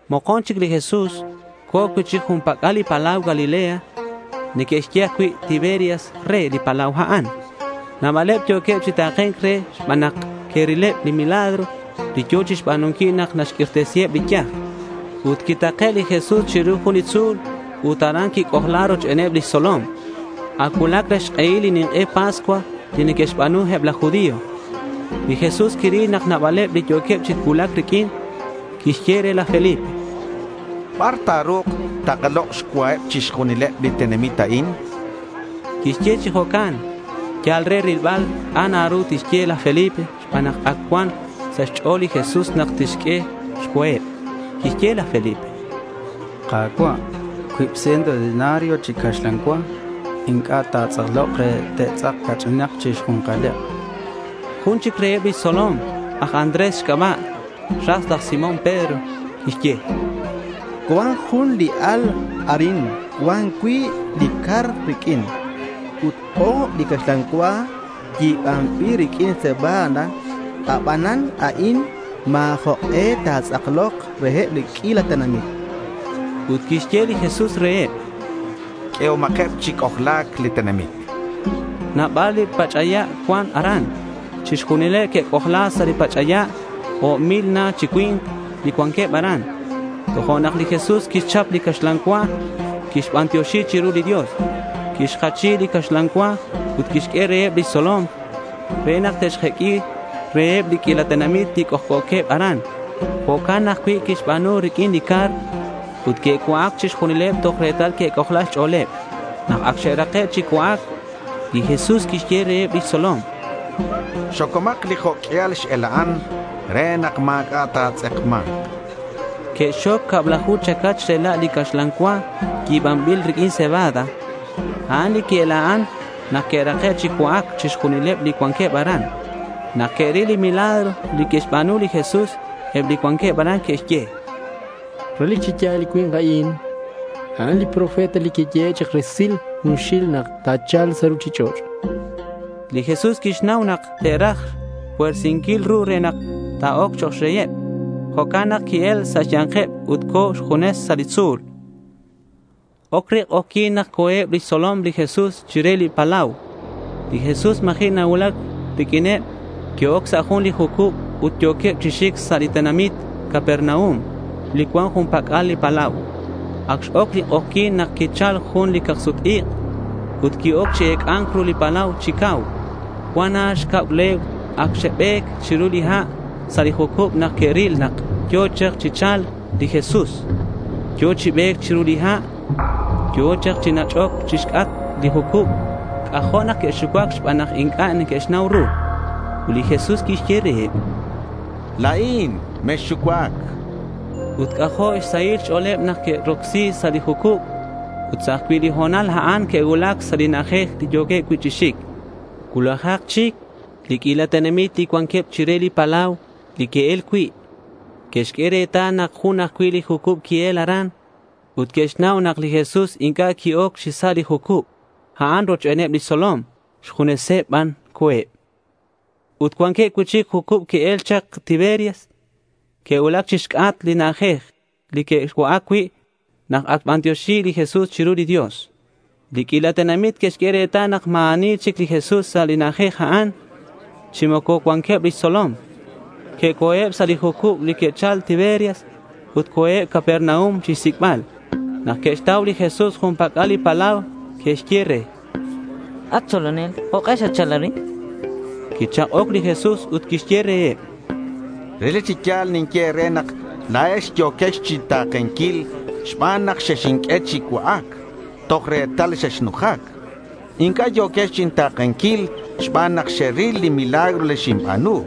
Mokon chic li Jesús co̱ cui'chic jun pac'al li palau Galilea. Neque'xye ajcui' Tiberias re li palau a'an. Nabaleb yo̱queb chi ta̱ke̱nc re xban nak que'rileb li milagro li yo̱ chixba̱nunquil nak naxq'uirtesiheb li yaj. Ut quitake' li Jesús chiru jun li tzu̱l ut aran quic'ojla rochbeneb lix tzolom. Ac cuulac re xk'ehil li nink'e Pascua, li neque'xba̱nu eb laj judío. Li Jesús quiril nak nabaleb li yo̱queb chi cuulac riq'uin. Quixye re laj Felipe: —¿Bar ta̱ru̱k takalok' xcuaheb chixjunileb li tenamit a'in? chan. Quixye chi jo'can yal re rilbal c'a' na ru tixye laj Felipe xban nak ac cuan sa' xch'o̱l li Jesús nak tixq'ue xcuaheb. Quixye laj Felipe: —Ka̱cua', cuib ciento denario chi caxlan cua inc'a' ta̱tz'aklok re te'tz'ak ca'ch'inak chi xju̱nkaleb, chan. Jun chic reheb lix tzolom aj Andrés xc'aba' ras laj Simón Pedro. Quixye: —Cuan jun li al arin cuan cuib li car riq'uin ut o̱b li caxlan cua yi̱banbil riq'uin cebada. Abanan a'in ma̱ jok'e ta̱tz'aklok reheb li q'uila tenamit, chan. Ut quixye li Jesús reheb: —Q'uehomakeb chi c'ojla̱c li tenamit.— Nabal li pach'aya' cuan aran. Chixjunileb que'c'ojla sa' li pach'aya'. O̱b mil na chi cui̱nk li cuanqueb aran. Tojo'nak li Jesús quixchap li caxlan cua. Quixbantioxi chiru li Dios. Quixjachi li caxlan cua ut quixq'ue reheb lix tzolom re nak te'xjeq'ui reheb li q'uila tenamit li c'ojc'o̱queb aran. Jo'can ajcui' quixba̱nu riq'uin li car. Ut que'cua'ac chixjunileb toj retal que'c'ojla xch'o̱leb. Nak ac xe'rake' chi cua'ac, li Jesús quixye reheb lix tzolom: —Xocomak li jo' q'uial x-ela'an re nak ma̱c'a' ta̱tz'ekma̱nk, chan. Que'xxoc cablaju chacach rela' li caxlan cua yi̱banbil riq'uin cebada. A'an li qui-ela'an nak que'rake' chi cua'ac chixjunileb li cuanqueb aran. Nak que'ril li milagro li quixba̱nu li Jesús, eb li cuanqueb aran que'xye: —Relic chi ya̱l li cui̱nk a'in, a'an li profeta li quiyehe' chak resil junxil nak ta̱cha̱lk sa' ruchich'och', chanqueb. Li Jesús quixnau nak te'raj xpuersinquil ru re nak ta̱oc chok' rey. Jo'can nak qui-el sa' xya̱nkeb ut co̱ xjunes sa' li tzu̱l. Oc re k'ojyi̱n nak co̱eb lix tzolom li Jesús chire li palau. Li Jesús ma̱ji' nacuulac riq'uineb. Que'oc sa' jun li jucub ut yo̱queb chi xic sa' li tenamit Capernaum li cuan jun pac'al li palau. Ac x-oc li k'ojyi̱n nak quichal jun cacuil ik' ut qui-oc chi ec'a̱nc ru li palau chi cau. Cuan na xcab legua ac xe'be̱c chiru li ha' sa' li jucub nak que'ril nak yo̱ chak chi cha̱lc li Jesús. Yo̱ chi be̱c chiru li ha'. Yo̱ chak chi nach'oc chixc'atk li jucub. C'ajo' nak que'xucuac xban nak inc'a' que'xnau ru. Ut li Jesús quixye reheb: —La̱in. Mexxucuac, chan. Ut c'ajo' xsahil xch'o̱leb nak que'rocsi sa' li jucub. Ut sa' ajcui' li ho̱nal a'an que'cuulac sa' li na'ajej li yo̱queb cui' chi xic. Cuulajak chic li q'uila tenamit li cuanqueb chire li palau li que'el cui', que'xq'ue retal nak jun ajcui' li jucub qui-el aran. Ut que'xnau nak li Jesús inc'a' qui-oc chi sa' li jucub a'an rochbeneb lix tzolom. Xjuneseb ban co̱eb. Ut cuanqueb cui'chic jucub que'el chak Tiberias que'cuulac chixc'atk li na'ajej li que'cua'ac cui' nak ac xbantioxi li Jesús chiru li Dios. Li q'uila tenamit que'xq'ue retal nak ma̱ ani chic li Jesús sa' li na'ajej a'an, chi moco cuanqueb lix tzolom. Que'oc sa' eb li jucub li que'chal Tiberias ut co̱eb Capernaum chixsic'bal. Nak que'xtau li Jesús jun pac'al li palau, que'xye re: —At tzolonel, ¿Jok'e xatchal arin?— Quichak'oc li Jesús ut quixye reheb: —Relic chi ya̱l ninye e̱re nak la̱ex yo̱quex chinta̱kenquil xban nak xexinq'ue chi cua'ac toj retal xexnujac. Inc'a' yo̱quex chinta̱kenquil xban nak xeril li milagro li xinba̱nu.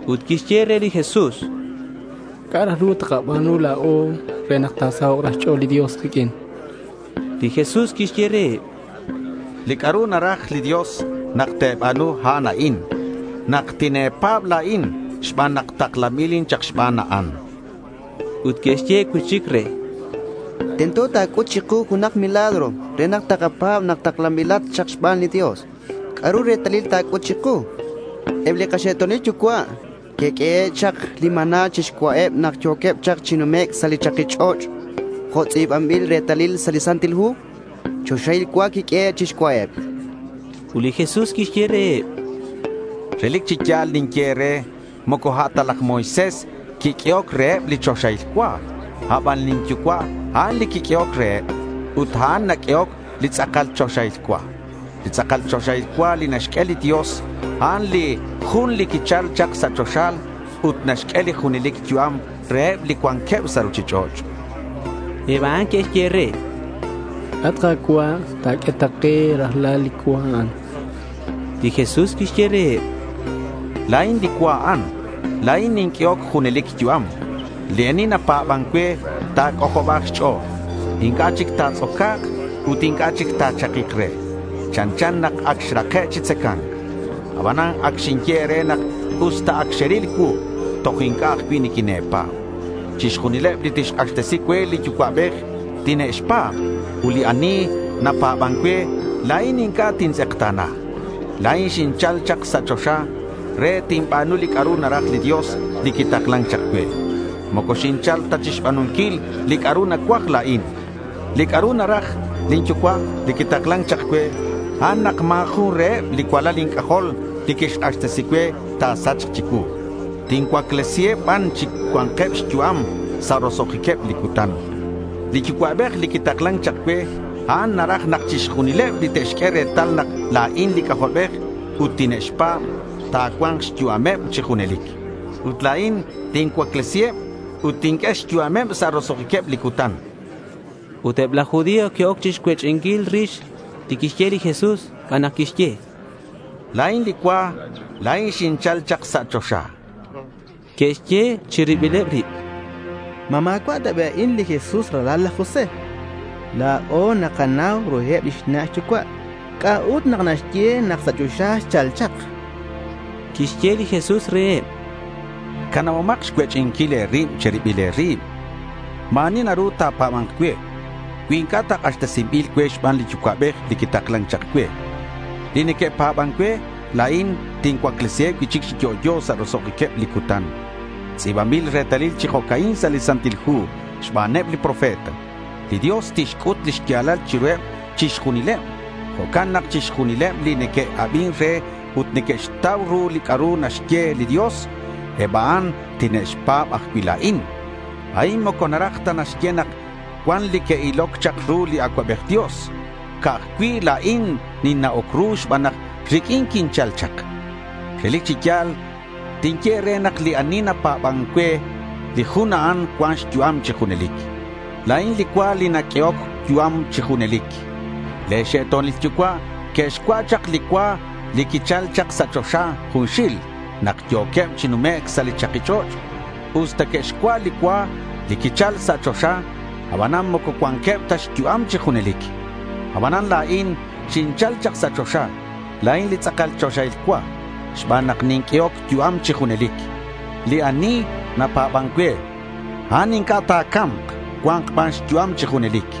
Ut que'xye re li Jesús: —¿C'a' raj ru takaba̱nu la̱o re nak ta̱sahok' xch'o̱l li Dios kiq'uin? chanqueb. Li Jesús quixye reheb: —Li c'a'ru naraj li Dios nak te̱ba̱nu, a'an a'in: nak tine̱pa̱b la̱in xban nak taklanbilin chak xban, chan. Ut que'xye cui'chic re: —Tento ta̱c'ut chiku junak li milagro re nak takapa̱b nak taklanbilat xban li Dios. ¿C'a'ru li retalil ta̱c'ut chiku? Eb li kaxe'to̱nil yucua' que'q'uehe' chak li maná chixcua'eb nak yo̱queb chak chi numec' sa' li chaki ch'och' jo' tz'i̱banbil retalil sa' li Santil Hu: Choxahil cua quiq'uehe' chixcua'eb. Ut li Jesús quixye reheb: —Relic chi ya̱l ninye e̱re, moco a' ta laj Moisés quiq'uehoc reheb li choxahil cua. A' ban lin Yucua', a'an li quiq'uehoc reheb. Ut a'an naq'uehoc li tz'akal choxahil cua. Li tz'akal choxahil cua li naxq'ue li Dios, a'an li jun li quichal chak sa' choxa ut naxq'ue li junelic yu'am reheb li cuanqueb sa' ruchich'och', chan. Eb a'an que'xye re: —At Ka̱cua', ta̱q'ue ta ke rajlal li cua a'an.— Li Jesús quixye reheb: —La̱in li cua a'an. La̱in ninq'uehoc junelic yu'am. Li ani napa̱ban cue ta̱c'ojoba̱k xch'o̱l. Inc'a' chic ta̱tz'oca̱k ut inc'a' chic ta̱chakik re. Chanchan nak ac xrake' chi tzaca̱nc. Aban ac xinye e̱re nak usta ac xeril cuu, toj inc'a' ajcui' niquine̱pa̱b. Chixjunileb li tixk'axtesi cue li Yucua'bej, tine'xpa̱b. Ut li ani napa̱ban cue, la̱in inc'a' tintz'ekta̱na. La̱in xinchal chak sa' choxa re tinba̱nu li c'a'ru naraj li Dios li quitaklan chak cue. Moco xinchal ta chixba̱nunquil li c'a'ru nacuaj la̱in. Li c'a'ru naraj lin Yucua' li quitaklan chak cue, a'an nak ma̱ jun reheb li cualal inc'ajol li xk'axtesi cue ta̱sachk chicuu. Tincuaclesiheb ban chi cua̱nkeb xyu'am sa' roso'jiqueb li cutan. Li Yucua'bej li quitaklan chak cue, a'an naraj nak chixjunileb li te'xq'ue retal nak la̱in li C'ajolbej ut tine'xpa̱b ta̱cua̱nk xyu'ameb chi junelic. Ut la̱in tincuaclesiheb ut tinq'ue xyu'ameb sa' roso'jiqueb li cutan, chan li Jesús. Ut eb laj judío que'oc chixcuech'inquil rix li quixye li Jesús xban nak quixye, “La̱in li cua. La̱in xinchal chak sa' choxa.” Que'xye chi ribileb rib: —¿Ma ma̱cua' ta bi' a'in li Jesús li ralal laj José? La̱o nakanau ruheb lix na' xyucua'. ¿C'a'ut nak naxye nak sa' choxa xchal chak? chanqueb. Quixye li Jesús reheb: —Canabomak xcuech'inquil e̱rib, chan. Ma̱ ani naru ta̱pa̱ba̱nk cue cui inc'a' ta k'axtesinbil cue xban li Yucua'bej li quitaklan chak cue. Li neque'pa̱ban cue, la̱in tincuaclesiheb cui'chic chi yo'yo sa' roso'jiqueb li cutan. Tz'i̱banbil retalil chi jo'ca'in sa' li Santil Hu xbaneb li profeta: Li Dios tixc'ut li xya̱lal chiruheb chixjunileb. Jo'can nak chixjunileb li neque'abin re ut neque'xtau ru li c'a'ru naxye li Dios, eb a'an tine'xpa̱b ajcui' la̱in. A'in moco naraj ta naxye nak cuan li que'iloc chak ru li Acuabej Dios. Ca'aj cui' la̱in ninna'oc ru xban nak riq'uin quinchal chak. Relic chi ya̱l tinye e̱re nak li ani napa̱ban cue, li jun a'an cuan xyu'am chi junelic. La̱in li cua li naq'uehoc yu'am chi junelic. Le̱ xe'to̱nil yucua' que'xcua' chak li cua li quichal chak sa' choxa junxil nak yo̱queb chi numec' sa' li chaki ch'och'. Usta que'xcua' li cua li quichal sa' choxa, abanan moco cuanqueb ta xyu'am chi junelic. Abanan, la̱in li xinchal chak sa' choxa, la̱in li tz'akal choxahil cua xban nak ninq'uehoc yu'am chi junelic. Li ani napa̱ban cue, a'an inc'a' ta̱ca̱mk. Cua̱nk ban xyu'am chi junelic.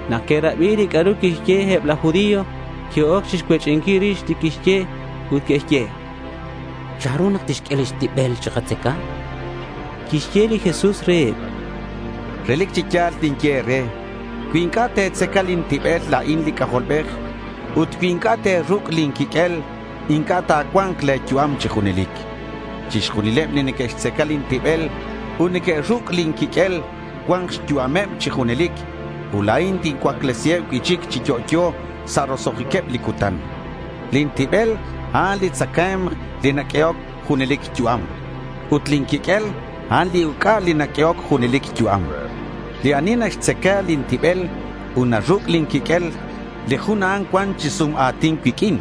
Nak que'rabi li c'a'ru quixye, eb laj judío que'oc chixcuech'inquil rix li quixye ut que'xye: —¿Chanru nak tixq'ue lix tibel re takatzaca? chanqueb. Quixye li Jesús reheb: —Relic chi ya̱l ninye e̱re: Cui inc'a' te̱tzaca lin tibel la̱in li C'ajolbej ut cui inc'a' te̱ruc' lin quiq'uel, inc'a' ta̱cua̱nk le̱ yu'am chi junelic. Chixjunileb li neque'xtzaca lin tibel ut neque'ruc' lin quiq'uel, cua̱nk xyu'ameb chi junelic, ut la̱in tincuaclesiheb cui'chic chi yo'yo sa' roso'jiqueb li cutan. Lin tibel, a'an li tzacae̱mk li naq'uehoc junelic yu'am. Ut lin quiq'uel, a'an li uc'a li naq'uehoc junelic yu'am. Li ani naxtzaca lin tibel ut naruc' lin quiq'uel, li jun a'an cuan chi sum a̱tin cuiq'uin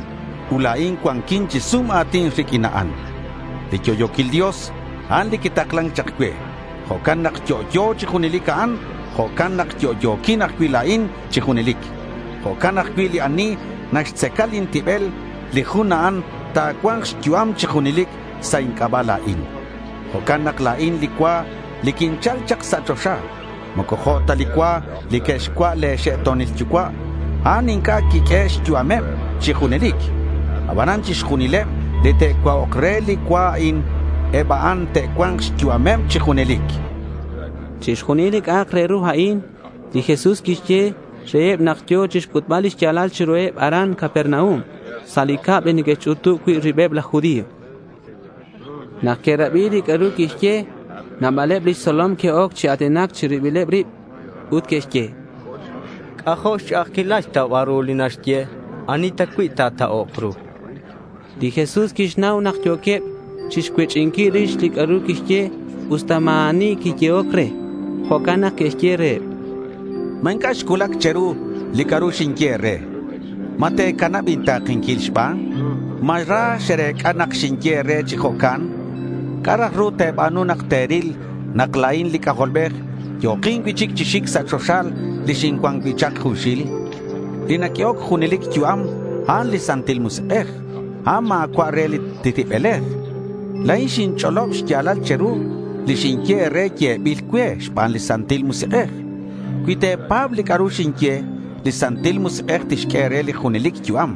ut la̱in cuanquin chi sum a̱tin riq'uin a'an. Li yo'yo̱quil Dios, a'an li quitaklan chak cue. Jo' nak yo'yo chi junelic a'an, jo'can nak yo'yo̱quin ajcui' la̱in chi junelic. Jo'can ajcui' li ani naxtzaca lin tibel, li jun a'an ta̱cua̱nk xyu'am chi junelic sa' inc'aba' la̱in. Jo'can nak la̱in li cua li quinchal chak sa' choxa. Moco jo' ta li cua li que'xcua' le̱ xe'to̱nil yucua'. A'an inc'a' quixq'ue xyu'ameb chi junelic. Abanan chixjunileb li te'cua'ok re li cua a'in, eb a'an te'cua̱nk xyu'ameb chi junelic, chan li Jesús. Chixjunil li c'a'ak re ru a'in li Jesús quixye reheb nak yo̱ chixc'utbal li xya̱lal chiruheb aran Capernaum sa' li cab li neque'xch'utub cui' ribeb laj judío. Nak que'rabi li c'a'ru quixye, nabaleb lix tzolom que'oc chi a̱tinac chi ribileb rib, ut que'xye: —C'ajo' xch'a'ajquil xtaubal ru li xye. ¿Ani ta cui' ta̱ta'ok ru? chanqueb. Li Jesús quixnau nak yo̱queb chixcuech'inquil rix li c'a'ru quixye usta ma̱ ani quiyehoc re. Jo'can nak quixye reheb: —¿Ma inc'a' xcuulac che̱ru li c'a'ru xinye e̱re? ¿Ma te̱canab inta̱kenquil xban? ¿Ma ra xerec'a nak xinye e̱re chi jo'can? ¿C'a' raj ru te̱ba̱nu nak te̱ril nak la̱in li C'ajolbej yo̱kin cui'chic chi xic sa' choxa li xincuan cui' chak junxil? Li naq'uehoc junelic yu'am, a'an li Santil Musik'ej. A'an ma̱cua' re li tibelej. La̱in xinch'olob xya̱lal che̱ru. Li xinye e̱re yebil cue xban li Santil Musik'ej. Cui te̱pa̱b li c'a'ru xinye, li Santil Musik'ej tixq'ue e̱re li junelic yu'am.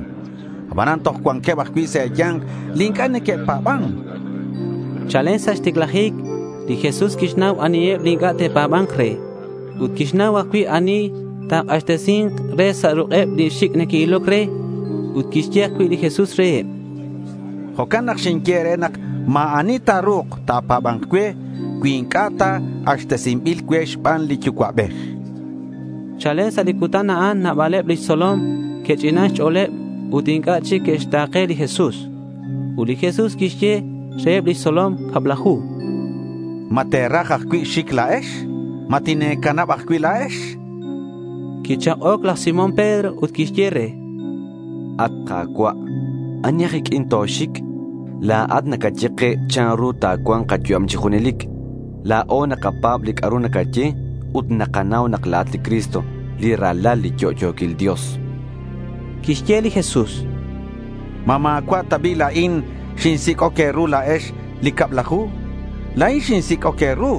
Abanan toj cuanqueb ajcui' sa' e̱ya̱nk li inc'a' neque'pa̱ban, chan li Jesús. Chalen sa' xticlajic li Jesús quixnau aniheb li inc'a' te'pa̱ba̱nk re. Ut quixnau ajcui' ani li ta̱k'axtesi̱nk re sa' ruk'eb li xic' que'iloc re. Ut quixye ajcui' li Jesús reheb: —Jo'can nak xinye e̱re nak ma̱ ani ta̱ru̱k ta̱pa̱ba̱nk cue cui inc'a' ta k'axtesinbil cue xban li Yucua'bej, chan. Chalen sa' li cutan a'an nabaleb lix tzolom que'ch'inan xch'o̱leb ut inc'a' chic que'xta̱ke li Jesús. Ut li Jesús quixye reheb lix tzolom cablaju: —¿Ma te̱raj ajcui' xic la̱ex? ¿Ma tine̱canab ajcui' la̱ex? chan reheb. Quichak'oc laj Simón Pedro ut quixye re: —At Ka̱cua', ¿ani aj iq'uin toxic? La̱at nacaye ke chanru ta̱cua̱nk kayu'am chi junelic. La̱o nakapa̱b li c'a'ru nacaye ut nakanau nak la̱at li Cristo, li Ralal li yo'yo̱quil Dios, chan. Quixye li Jesús: —¿Ma ma̱cua' ta bi' la̱in xinsic'oc e̱ru la̱ex li cablaju? La̱in xinsic'oc e̱ru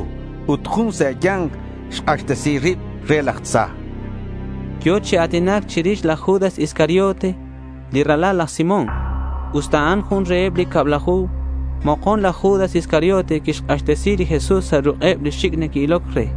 ut jun sa' e̱ya̱nk xk'axtesi rib re laj tza, chan. Yo̱ chi a̱tinac chirix laj Judas Iscariote, li ralal laj Simón. Usta a'an jun reheb li cablaju, mokon laj Judas Iscariote quixk'axtesi li Jesús sa' ruk'eb li xic' neque'iloc re.